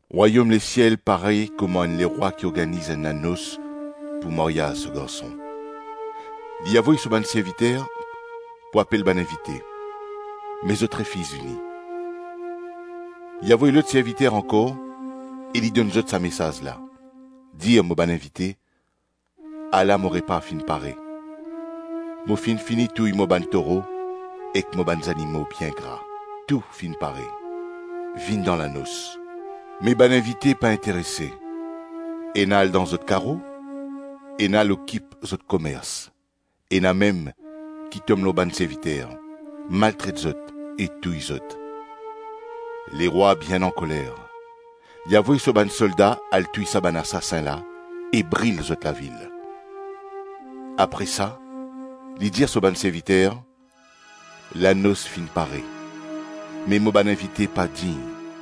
“Rwayom lesiel parey kouma enn lerwa ki organiz enn lanos pou maryaz so garson. Li avoy so bann serviter pou apel bann invite, me zot refiz vini. Li avoy lot serviter ankor e li donn zot sa mesaz la: ‘Dir mo bann invite, “Ala mo repa finn pare, mo finn fini touy mo bann toro ek mo bann zanimo bien gra, tou finn pare. Vinn dan lanos.” Me bann invite pa interese, ena al dan zot karo, ena al okip zot komers, ena mem ki tom lor bann serviter, maltret zot e touy zot. Lerwa bien ankoler; li avoy so bann solda al touy sa bann asasin la e bril zot lavil. Apre sa, li dir so bann serviter, ‘Lanos finn pare, me mo bann invite pa dign.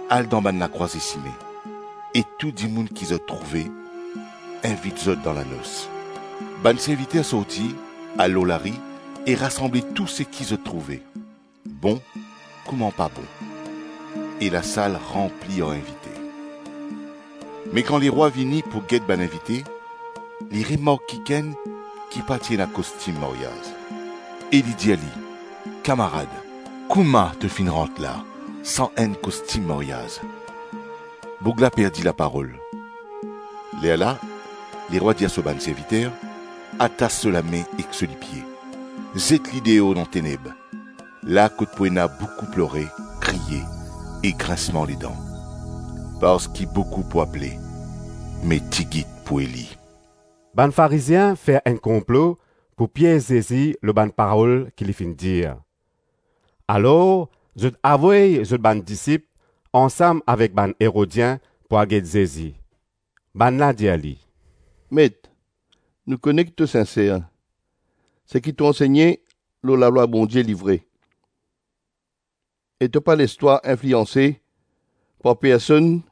Al dan bann lakrwaze sime e tou dimoun ki zot trouve invit zot dan lanos.’ Bann serviter sorti, al lor lari e rasanble tou seki zot trouve, bon kouma pa bon; e lasal ranpli ar invite. Me kan lerwa vini pou get bann invite, li remark kikenn ki pa ti ena kostim maryaz, e li dir li, ‘Kamarad, kouma to finn rant la san enn kostim maryaz?’ Boug la perdi laparol. Lerla lerwa dir so bann serviter, ‘Atas so lame ek so lipie, zet li deor dan teneb, la kot pou ena boukou plore, kriye ek grinsman ledan.’ Parski boukou pou apele, me tigit pou eli.” Bann Farizien fer enn konplo pou piez Zezi lor bann parol ki li finn dir. Alor, zot avoy zot bann disip, ansam avek bann Erodien pou al get Zezi. Bann la dir li, “Met, nou kone ki to sinser, seki to ansegne lor lalwa Bondie li vre, e to pa les twa inflianse par personn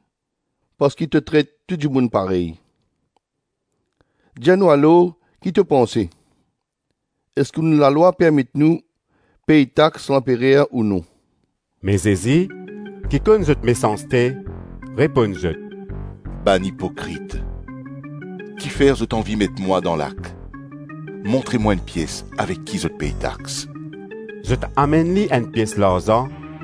parski to tret to dimoun parey. Dir nou alor, ki to panse: Eski nou lalwa permet nou pey tax lanperer ou non?” Me Zezi, ki konn zot mesanste, reponn zot, “Bann ipokrit, kifer zot anvi met mwa dan lak? Montre mwa enn pies avek ki zot pey tax.” Zot amenn li enn pies larzan.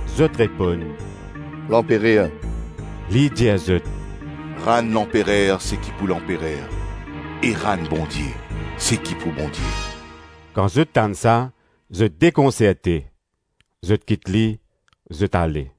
Zot reponn, “Lanperer.” Li dir zot, “Rann lanperer seki pou lanperer e rann Bondie seki pou Bondie.” Kan zot tann sa, zot dekonserte, zot kit li, zot ale.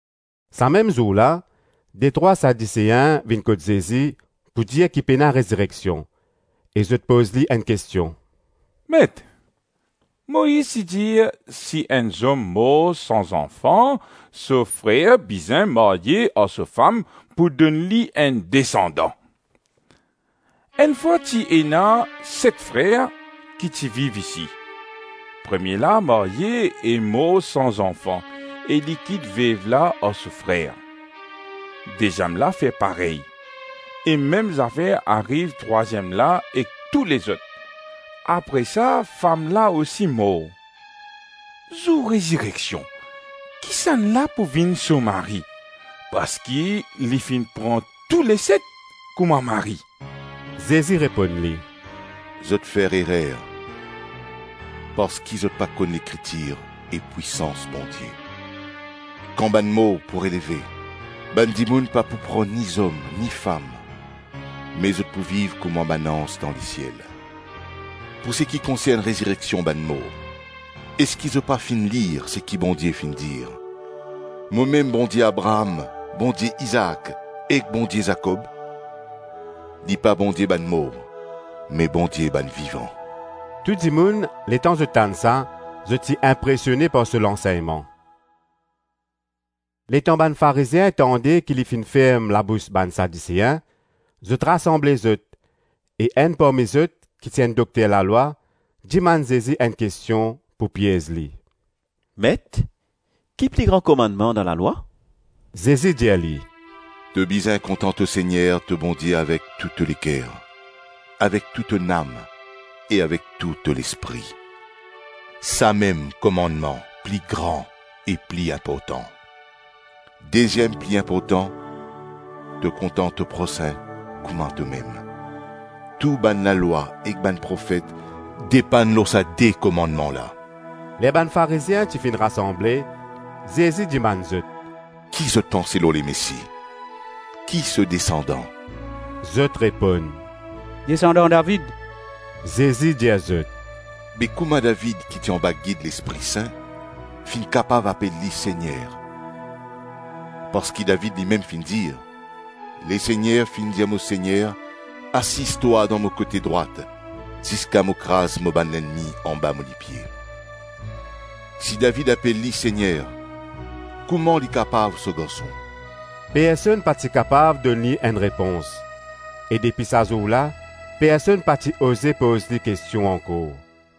Sa mem zour la, detrwa Sadisein vinn kot Zezi pou dir ki pena rezireksion e zot poz li enn kestion: “Met, Moiz ti dir, ‘Si enn zom mor san zanfan, so frer bizin marye ar so fam pou donn li enn desandan. Enn fwa ti ena set frer ki ti viv isi. Premie la marye e mor san zanfan e li kit vev la ar so frer. Deziem la fer parey, e mem zafer ariv trwaziem la ek tou lezot. Apre sa, fam la osi mor. Zour rezireksion, kisannla pou vinn so mari, parski li finn pran touleset kouma mari?” Zezi reponn li, “Zot fer erer, parski zot pa konn Lekritir e pwisans Bondie. Kan bann mor pou releve, bann dimoun pa pou pran ni zom ni fam, me zot pou viv kouma bann anz dan lesiel. Pou seki konsern rezireksion bann mor, eski zot pa finn lir seki Bondie finn dir, ‘Momem Bondie Abraam, Bondie Izaak, ek Bondie Zakob?’ Li pa Bondie bann mor me Bondie bann vivan.” Tou dimoun letan zot tann sa, zot ti inpresione par so lansegnman. Letan bann Farizien tande ki li finn ferm labous bann Sadisein, zot rasanble zot, e enn parmi zot ki ti enn dokter lalwa, dimann Zezi enn kestion pou piez li. “Met, ki pli gran komannman dan lalwa? “ Zezi dir li, “‘To bizin kontan to Segner, to Bondie avek tou to leker, avek tou to nam e avek tou to lespri.’ Samem komannman pli gran e pli inportan. Deziem pli inportan ‘To kontan to prosin kouma tomem’ Tou bann lalwa ek bann profet depann lor sa de komannman la.” Ler bann Farizien ti finn rasanble, Zezi dimann zot: “Ki zot panse lor Lemesi? Ki so desandan?” Zot reponn, “Desandan David”. Zezi dir zot, “Be kouma David ki ti anba gid Lespri Sin, finn kapav apel li ‘Segner’? Parski David limem finn dir: ‘Lesegner finn dir mo Segner, asiz twa dan mo kote drwat ziska mo kraz mo bann lennmi anba mo lipie.’” “Si David apel li Segner, kouma li kapav so garson?” Personn pa ti kapav donn li enn repons, e depi sa zour la, personn pa ti oze poz li kestion ankor.